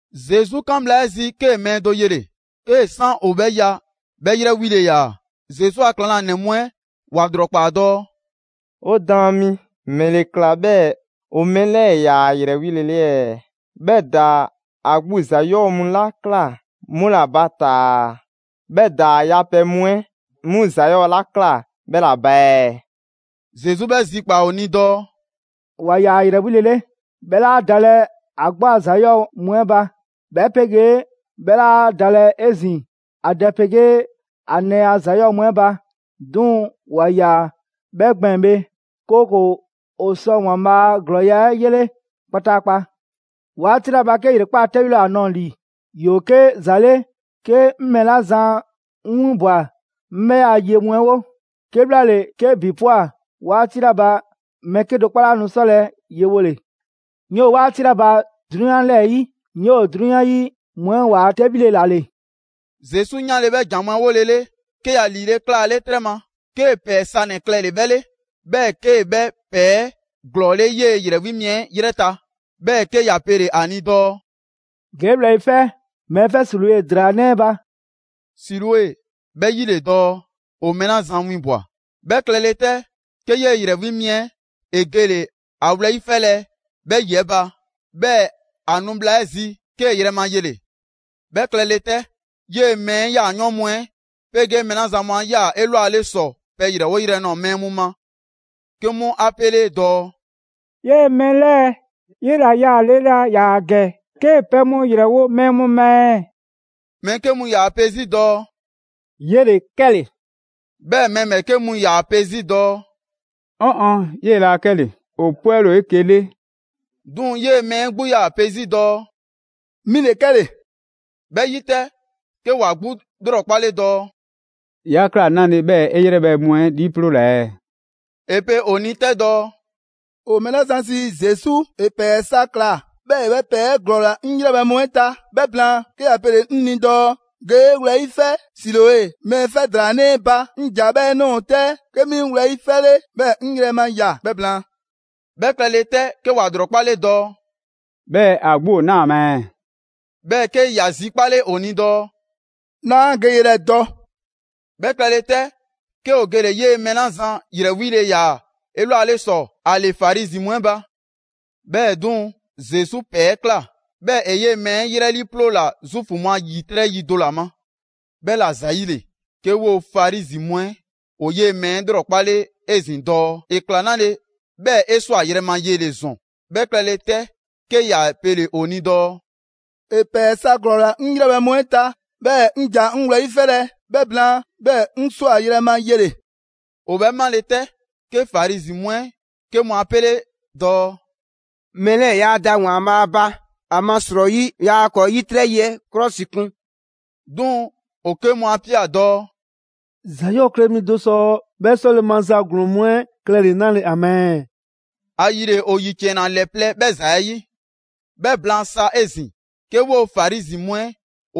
Zesu 'kan bhla 'ɛ zi, 'kee‑ mɛɛ do yele‑: 'kee‑ 'san ‑o 'bhɛ ya, 'bhɛ 'yrɛ 'wile‑ ‑yaa. Zesu a ‑klaŋlanɛ mu 'ɛ ‑wa ‑lrɔkpaa dɔɔ: «'O Daan mi, ‑mɛle ‑kla 'bhɛɛ‑ ‑o mɛɛ 'lɛɛ‑ 'yaa‑ ‑a ‑yrɛ 'wile‑ 'le ɛɛ? 'Bhɛ ‑daa ‑a 'gbu ‑za 'yɔɔ‑ mu 'la ꞊kla 'mu ‑la ba taa‑, 'bhɛ ‑daa ‑a yapɛ mu 'ɛ 'mu ‑za 'yɔɔ‑ 'la ꞊kla 'bhɛ ‑la ba ɛɛ?» Zesu 'bhɛ zikpaa‑ ‑o ni dɔɔ: «‑Wa ‑yaa ‑a ‑yrɛ 'wile‑ 'le, 'bhɛ 'laa dalɛ ‑a 'gbu a ‑za 'yɔɔ‑ mu 'ɛ ba, 'bhɛ 'pegee 'bhɛ 'laa dalɛ 'ezin‑ ‑a dɛ 'pegee ‑a nɛɛ a ‑za 'yɔɔ‑ mu 'ɛ ba; 'duŋ‑ ‑wa ‑yaa 'bhɛ gbɛɛn‑ bhe, 'kooko‑ ‑o sɔ ‑Waanbhaa' a ‑glɔɔya' 'ɛ 'yele kpataakpa. 'Waati 'la ba 'ke ‑yrekpaa' 'tɛbhile ‑o ‑a nɔɔ‑ ‑li, ‑yoo 'ke ‑za 'le 'ke 'ŋ mɛɛ 'la zan 'ŋ 'winbwa‑ 'ŋ 'bhɛ a ye mu 'ɛ 'wo. 'Kebhlaale, 'ke ‑bi ꞊pwa 'waati 'la ba mɛɛ 'kedo‑ 'kpɔ 'laa nu 'sɔlɛ‑ yewole. 'Ŋ 'yoo‑ 'waati 'la ba 'drunyan 'lɛɛ‑ 'yi, 'ŋ 'yoo‑ 'drunyan 'yi mu 'ɛ waa 'tɛbhile ‑la ‑le.» Zesu 'yanle 'bhɛ ‑jan mu 'ɛ 'wolele, 'ke ‑ya ‑liile' 'klaale 'trɛ ma, 'kee‑ ‑pɛɛ sanɛ‑ klɛle‑ 'bhɛ 'le. 'Bhɛɛ‑ 'kee‑ 'bhɛ ‑pɛɛ 'ɛ ‑glɔɔle' 'yee‑ ‑yrɛ 'wi mi 'ɛ 'yrɛ ta. 'Bhɛɛ‑ 'ke ‑ya pele‑ ‑a ni dɔɔ: «Ge 'e wlɛyi' 'fɛ mɛɛ 'fɛ Siloe ‑draa 'nɛ 'ɛ ba ('Siloe 'bhɛ 'yi ‑le dɔɔ: ‹‑O mɛɛ 'la zan winbwa‑›).» 'Bhɛ klɛle 'tɛ, 'ke 'yee‑ ‑yrɛ 'wi mi 'ɛ ‑e gele‑ ‑a wlɛyi' 'fɛlɛ‑ 'bhɛ ‑yi 'ɛ ba, 'bhɛɛ‑ ‑a nu bhla 'ɛ zi, 'kee‑ yrɛ ma yele‑. 'Bhɛ klɛle 'tɛ, 'yee‑ mɛɛ 'ɛ yaayɔɔn' mu 'ɛ 'pegee mɛɛ 'la zan mu 'a ꞊ya 'elwale ‑sɔ pɛ ‑yrɛwo' yrɛ nɔɔ‑ mɛɛ mu ma, 'ke 'mu 'a 'pele dɔɔ: «'Yee‑ mɛɛ 'lɛɛ‑ 'yela‑ yaale laa ‑yaa ‑gɛ 'kee‑ pɛ mu ‑yrɛwo' mɛɛ mu ma ɛɛ?» Mɛɛ 'ke mu ‑yaa pe 'zi dɔɔ: «'Yele‑ 'kɛle‑!» 'Bhɛɛ‑ mɛɛ ‑bhɛɛke' mu ‑yaa pe 'zi dɔɔ: «'Ɔn ɔn, 'yee‑ laa 'kɛle‑, ‑o 'pwɛle‑ ‑o 'eke‑ 'le.» 'Duŋ‑ 'yee‑ mɛɛ 'ɛ 'gbu 'yaa‑ pe 'zi dɔɔ: «'Mi ‑le 'kɛle‑.» 'Bhɛ 'yi 'tɛ, 'ke ‑wa 'gbu 'lrɔkpale dɔɔ: «'Ya ‑kla 'nale‑ 'bhɛɛ‑ 'e 'yrɛbhɛ‑ mu 'ɛ 'liiploola ɛɛ?» ‑E pe ‑o ni 'tɛ dɔɔ: «‑O mɛɛ 'la zan sii Zesu, ‑e ‑pɛɛ sa ‑kla 'bhɛɛ‑ ‑e 'bhɛ ‑pɛɛ 'ɛ ‑glɔɔla 'ŋ 'yrɛbhɛ‑ mu 'ɛ ta, 'bhɛ blaan, 'ke ‑ya pele‑ 'ŋ ni dɔɔ: ‹Ge 'e wlɛyi' 'fɛ Siloe mɛɛ 'fɛ ‑draa 'nɛ 'ɛ ba›. 'Ŋ ‑ja 'bhɛɛ‑ ꞊nɔɔ 'tɛ, 'ke 'mi 'ŋ wlɛyi' 'fɛle, 'bhɛɛ‑ 'ŋ yrɛ ma ꞊ya 'bhɛ blaan.» 'Bhɛ klɛle 'tɛ, 'ke ‑wa ‑lrɔkpale dɔɔ: «'Bhɛɛ‑ ‑a 'gbu ‑o 'naa‑ ma ɛɛ?» 'Bhɛɛ‑ 'ke ‑ya zikaple ‑o ni dɔɔ: «'Naa 'a geyrɛ dɔ.» 'Bhɛ klɛle 'tɛ, 'ke ‑o gele‑ 'yee‑ mɛɛ 'la zan ‑yrɛ 'wile‑ ‑yaa 'elwale ‑sɔ ‑a ‑le Farizi mu 'ɛ ba. 'Bhɛɛ‑ 'duŋ‑, Zesu ‑pɛɛ 'ɛ ꞊kla, 'bhɛɛ‑ ‑e 'yee‑ mɛɛ 'ɛ 'yrɛ 'liiploola Zuufu mu a ‑yitrɛ' yi do ‑la ma. 'Bhɛla‑ ‑zayile, 'ke 'woo‑ Farizi mu 'ɛ ‑o 'yee‑ mɛɛ 'ɛ 'lrɔkpale 'ezin‑ dɔɔ ‑e ꞊kla 'nale‑ 'bhɛɛ‑ ‑e ‑swa yrɛma yele‑ ‑zɔn. 'Bhɛ klɛle 'tɛ 'ke ‑ya pele‑ ‑o ni dɔɔ: «‑E ‑pɛɛ sa ‑glɔɔla 'ŋ 'yrɛbhɛ‑ mu 'ɛ ta, 'bhɛɛ‑ 'ŋ ‑ja 'ŋ wlɛyi' 'fɛlɛ‑; 'bhɛ blaan, 'bhɛɛ‑ 'ŋ 'swa‑ yrɛma yele‑.» ‑O 'bhɛ 'male‑ 'tɛ, 'ke Farizi mu 'ɛ 'ke mu 'a 'pele dɔɔ: «Mɛɛ 'lɛɛ‑ yaa da ‑Waanbhaa' ba, ‑amasrɔyi yaa ‑kɔɔ ‑yitrɛ' yi 'ɛ 'klɔsikun.» 'Duŋ‑ ‑o 'ke mu 'a ꞊pia dɔɔ: «‑Za 'yɔɔ‑ klɛ mi do sɔ 'bhɛ 'sɔle‑ maza ‑glɔɔn mu 'ɛ klɛle‑ 'nale‑ ‑a ma ɛɛ?» ‑Ayile ‑o ‑yiciɛnna ‑lɛ plɛ 'bhɛ ‑za 'ɛ 'yi. 'Bhɛ blaan sa 'ezin‑, 'ke 'woo‑ Farizi mu 'ɛ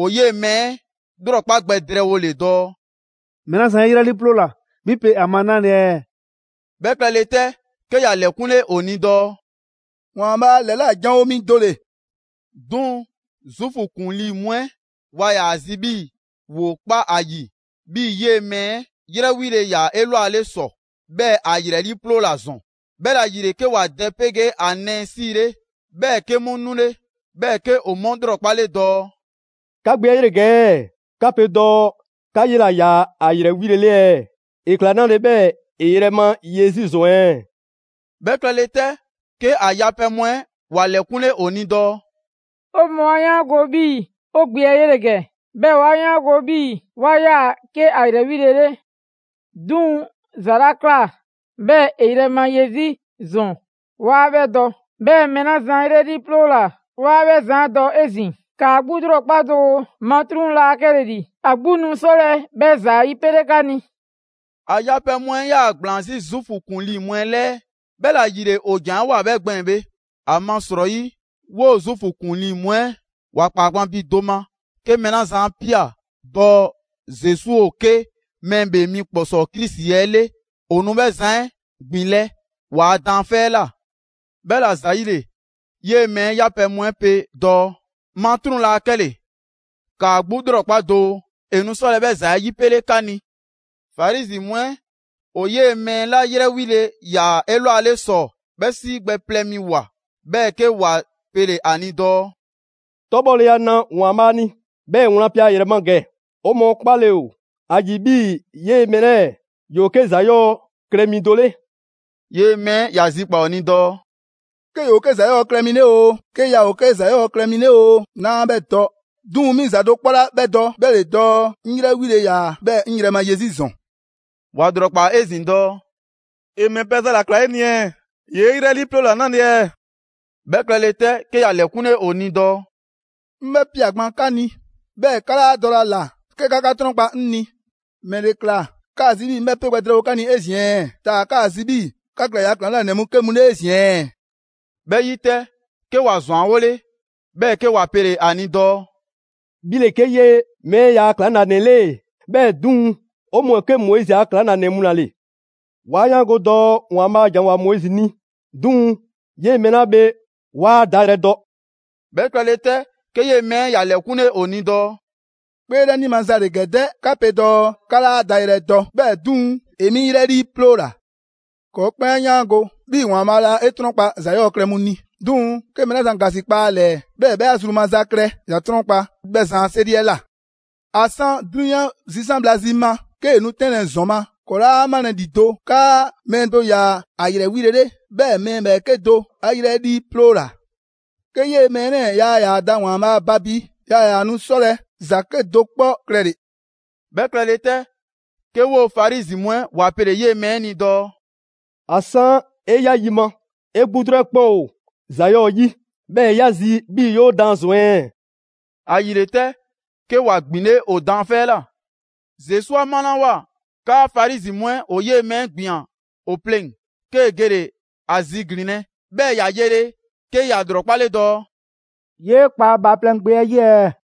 ‑o 'yee‑ mɛɛ 'ɛ 'lrɔkpa gbɛ drɛɛwole dɔɔ: «Mɛɛ 'la zan 'e 'yrɛ 'liiploola 'bhi pe ‑a ma 'nale‑ ɛɛ?» 'Bhɛ klɛle 'tɛ, 'ke ‑ya ‑lɛkunle ‑o ni dɔɔ: «‑Waanbhaa' ‑lɛla' ‑janwo' mi do ‑le.» 'Duŋ‑ Zuufu ‑kuŋlii mu 'ɛ waa ‑yaa ‑a zi 'bhii‑ ‑woo 'kpa 'a ‑yi 'bhii‑ 'yee‑ mɛɛ 'ɛ 'yrɛ 'wile‑ ‑yaa 'elwale ‑sɔ, 'bhɛɛ‑ ‑a ‑yrɛ 'liiploola ‑zɔn. 'Bhɛla‑ ‑yile 'ke ‑wa dɛ 'pegee ‑a nɛɛ 'siile, 'bhɛɛ‑ 'ke 'mu 'nule. 'Bhɛɛ‑ 'ke ‑o 'mu 'lrɔkpale dɔɔ: «'Ka gbe 'ɛ 'yele‑ ‑gɛ ɛɛ? 'Ka pe dɔɔ 'ka 'yela‑ ‑yaa ‑a ‑yrɛ 'wile‑ 'le ɛɛ? ‑E ‑kla 'nale 'bhɛɛ‑ ‑e yrɛma ye 'zi ‑zɔn ɛɛ?» 'Bhɛ klɛle 'tɛ, 'ke ‑a yapɛ mu 'ɛ ‑wa ‑lɛkunle ‑o ni dɔɔ: «'O mɔɔ 'a 'yaango‑ 'bhii‑ 'o gbe 'ɛ 'yele‑ ‑gɛ, 'bhɛɛ‑ 'wa 'yaango‑ 'bhii‑ 'wa 'yaa‑ 'ke ‑a ‑yrɛ 'wile‑ 'le. 'Duŋ‑ ‑za 'la ꞊kla 'bhɛɛ‑ ‑e yrɛma ye 'zi ‑zɔn 'waa 'bhɛ dɔ. 'Bhɛɛ‑ mɛɛ 'la zan ‑a ‑yrɛ 'liiploola, 'waa 'bhɛ zan 'ɛ dɔ 'ezin‑. ‑Kaa 'gbu 'lrɔkpa doo, matruŋ 'laa 'kɛle‑ ‑li, ‑a 'gbu nu 'sɔlɛ‑ 'bhɛ ‑za 'ɛ 'yipele 'ka ni!» ‑A yapɛ mu 'ɛ 'yaa‑ ‑gblaan 'zi Zuufu ‑kuŋlii mu 'ɛ 'lɛɛ, 'bhɛla‑ ‑yile ‑o ‑janwoa 'bhɛ gbɛɛn‑ bhe. ‑Amasrɔyi 'woo‑ Zuufu ‑kuŋlii mu 'ɛ ‑wa ‑kpaa gban bi do ma 'ke mɛɛ 'la zan 'a ꞊pia dɔɔ Zesu 'ke Mɛɛ ‑Bhee Mi ‑Kpɔsɔɔ Krisi 'ɛ 'le, ‑o nu 'bhɛ zan 'ɛ ‑gbinlɛ' ‑waa' daanfɛ' 'ɛ ꞊la. 'Bhɛla‑ ‑zayile, 'yee‑ mɛɛ 'ɛ 'yapɛ‑ mu 'ɛ pe dɔɔ: «Matruŋ 'laa 'kɛle‑, ‑kaa 'gbu 'lrɔkpa doo, ‑e nu 'sɔlɛ‑ 'bhɛ ‑za 'ɛ 'yipele 'ka ni!» Farizi mu 'ɛ ‑o 'yee‑ mɛɛ 'la 'yrɛ 'wile‑ ‑yaa 'elwale ‑sɔ, 'bhɛ 'sii gbɛ plɛ mi ꞊woa, 'bhɛɛ‑ 'ke ‑wa pele‑ ‑a ni dɔɔ: «'Tɔbhɔleya na ‑Waanbhaa' ni, 'bhɛɛ‑ wlan pe ‑a ‑yrɛ ma ‑gɛ. 'O mɔɔ 'kpale‑ ‑o ‑a ‑yi 'bhii‑ 'yee‑ mɛɛ 'lɛɛ‑ ‑yoo 'ke ‑za 'yɔɔ‑ klɛ mi do 'le.» 'Yee‑ mɛɛ 'ɛ ‑ya zikpaa‑ ‑o ni dɔɔ: «'Ke ‑yoo 'ke ‑za 'yɔɔ‑ klɛ mi 'le oo, 'ke yaa ‑o 'ke ‑za 'yɔɔ‑ klɛ mi 'le oo, 'naa 'bhɛ dɔ. 'Duŋ‑ 'mi ‑za do 'kpɔ 'la 'bhɛ dɔ, 'bhɛ ‑le dɔɔ 'ŋ 'yrɛ 'wile‑ ‑yaa, 'bhɛɛ‑ 'ŋ yrɛma ye 'zi ‑zɔn.» ‑Wa ‑lrɔkpaa 'ezin‑ dɔɔ: «‑E ‑mɛ pɛ za ‑la ‑kla 'e ni ɛɛ? ‑Yee' 'yrɛ 'liiploola 'nale‑ ɛɛ?» 'Bhɛ klɛle 'tɛ, 'ke ‑ya ‑lɛkunle ‑o ni dɔɔ: «'Ŋ 'bhɛ ꞊pia gban 'ka ni, 'bhɛɛ‑ 'ka 'laa dɔlɛ ‑a ꞊la 'ke 'ka 'ka 'trɔnkpa 'ŋ ni. ‑Mɛle ‑kla 'kaa‑ zi 'bhii‑ 'ŋ 'bhɛ 'pe gbɛ drɛɛwo 'ka ni 'ezin‑ ɛɛ? Taa‑ 'kaa‑ zi 'bhii‑ 'ka klɛ ‑yaa' ‑klaŋlanɛ mu 'ke mu 'le 'ezin‑ ɛɛ?» 'Bhɛ 'yi 'tɛ, 'ke ‑wa ‑zwanwole, 'bhɛɛ‑ 'ke ‑wa pele‑ ‑a ni dɔɔ: «'Bhi ‑le 'ke 'yee‑ mɛɛ 'ɛ ‑yaa ‑klaŋlanɛ 'le! 'Bhɛɛ‑ 'duŋ‑, 'o mɔɔ ‑o 'ke Moizi a ‑klaŋlanɛ mu ‑la ‑le. 'Wa 'yaango‑ dɔɔ ‑Waanbhaa' ‑janwoa Moizi ni; 'duŋ‑ 'yee‑ mɛɛ 'la bhe 'waa ‑a dayrɛ dɔ!» 'Bhɛ klɛle 'tɛ, 'ke 'yee‑ mɛɛ ‑ya ‑lɛkunle ‑o ni dɔɔ: «'Kpeelɛni maza ‑le ‑gɛ 'dɛ! 'Ka pe dɔɔ 'ka 'laa ‑a dayrɛ dɔ, 'bhɛɛ‑ 'duŋ‑, ‑e 'mi 'yrɛ 'liiploola. ‑Kɔɔ' 'kpɛn 'a 'yaango‑ 'bhii‑ ‑Waanbhaa' laa 'e 'trɔnkpa‑ ‑za 'yɔɔ‑ klɛ mu ni, 'duŋ‑ 'ke mɛɛ 'la zan ‑gasikpa ‑a ‑lɛɛ, 'bhɛɛ‑ 'bhɛ 'a zru maza klɛ, ‑ya 'trɔnkpa‑ 'bhɛɛ‑ zan 'a 'seri 'ɛ ꞊la. ‑A 'san 'drunyan zisan' bhla zi ma, 'kee‑ nu 'tɛnlɛ‑ ‑zɔn ma, ‑kɔɔ' 'laa 'malɛ‑ ‑lido' 'kaa mɛɛ do ‑yaa ‑a ‑yrɛ 'wile‑ 'le, 'bhɛɛ‑ mɛɛ ‑bhɛɛke' do 'a 'yrɛ 'liiploola. 'Ke 'yee‑ mɛɛ 'lɛɛ‑ yaa ‑yaa da ‑Waanbhaa' ba bi, yaa ‑yaa nu 'sɔlɛ‑ ‑za 'kedo‑ 'kpɔ klɛle‑.» 'Bhɛ klɛle 'tɛ, 'ke 'woo‑ Farizi mu 'ɛ ‑wa pele‑ 'yee‑ mɛɛ 'ɛ ni dɔɔ: «‑A 'san 'e 'ya yi ma, 'e 'gbutru 'ɛ 'kpɛn ‑o ‑za 'yɔɔ‑ 'yi; 'bhɛɛ‑ 'ya zi 'bhii‑ 'yoo daan ‑zɔn ɛɛ? ‑Ayile 'tɛ, 'ke ‑wa ‑gbinle' ‑o daanfɛ' 'ɛ ꞊la.» Zesu 'a 'malawoa 'kaa Farizi mu 'ɛ ‑o 'yee‑ mɛɛ 'ɛ ‑gbian ‑o pleŋ‑, 'kee‑ gele‑ ‑a ziglinlɛ, 'bhɛɛ‑ ‑ya yele, 'ke ‑ya ‑lrɔkpale dɔɔ: «'Yee kpa Bhaaplɛŋ Gbe 'ɛ 'yi ɛɛ?»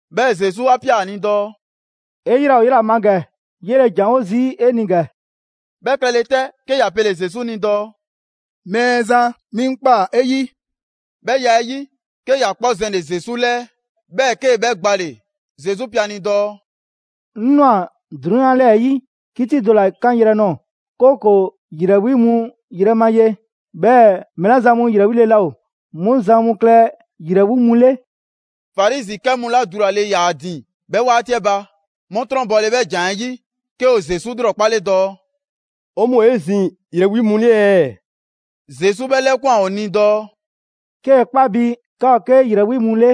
'Bhɛɛ‑ Zesu 'a ꞊pia ‑a ni dɔɔ: «'E 'yrɛ ‑o 'yela‑ ma ‑gɛ, 'yele‑ ‑janwo' zii' 'e ni ‑gɛ.» 'Bhɛ klɛle 'tɛ, 'ke ‑ya pele‑ Zesu ni dɔɔ: «Mɛɛzan, 'mi 'ŋ ꞊kpaa 'e 'yi.» 'Bhɛ ya 'ɛ 'yi, 'ke ‑ya 'kpɔ zɛnle‑ Zesu 'lɛɛ‑, 'bhɛɛ‑ 'kee‑ 'bhɛ gbale‑. Zesu pe ‑a ni dɔɔ: «'Ŋ ꞊nwa 'drunyan 'lɛɛ‑ 'yi 'kiti do ‑la 'kanyrɛ‑ nɔɔ‑; 'kooko‑ ‑yrɛ 'wi mu yrɛ ma ye, 'bhɛɛ‑ mɛɛ 'la zan mu ‑yrɛ 'wile‑ laa ‑o, 'mu zan mu klɛ ‑yrɛ 'wi mu 'le.» Farizi 'kɛ mu 'la dulale 'yaa‑ ‑a ‑din 'bhɛ 'waati 'ɛ ba, 'mu 'trɔnbɔle 'bhɛ ‑jan 'ɛ 'yi, 'ke ‑o Zesu 'lrɔkpale dɔɔ: «'O mɔɔ ‑o 'ezin‑ ‑yrɛ 'wi mu 'le ɛɛ?» Zesu 'bhɛ 'lɛkwan‑ ‑o ni dɔɔ: «'Kee‑ 'kpa bi 'ka ‑o 'ke ‑yrɛ 'wi mu 'le,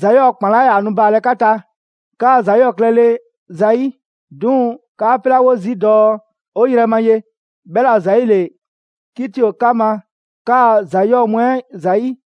‑za 'yɔɔ‑ ‑kpan 'laa ‑yaa nu baalɛ 'ka ta, 'kaa ‑za 'yɔɔ‑ klɛle ‑zayi'. 'Duŋ‑ 'kaa 'pelawo zii' dɔɔ: ‹'O yrɛ ma ye›. 'Bhɛla‑ ‑zayile 'kiti ‑o 'ka ma 'kaa‑ ‑za 'yɔɔ mu 'ɛ ‑zayi'.»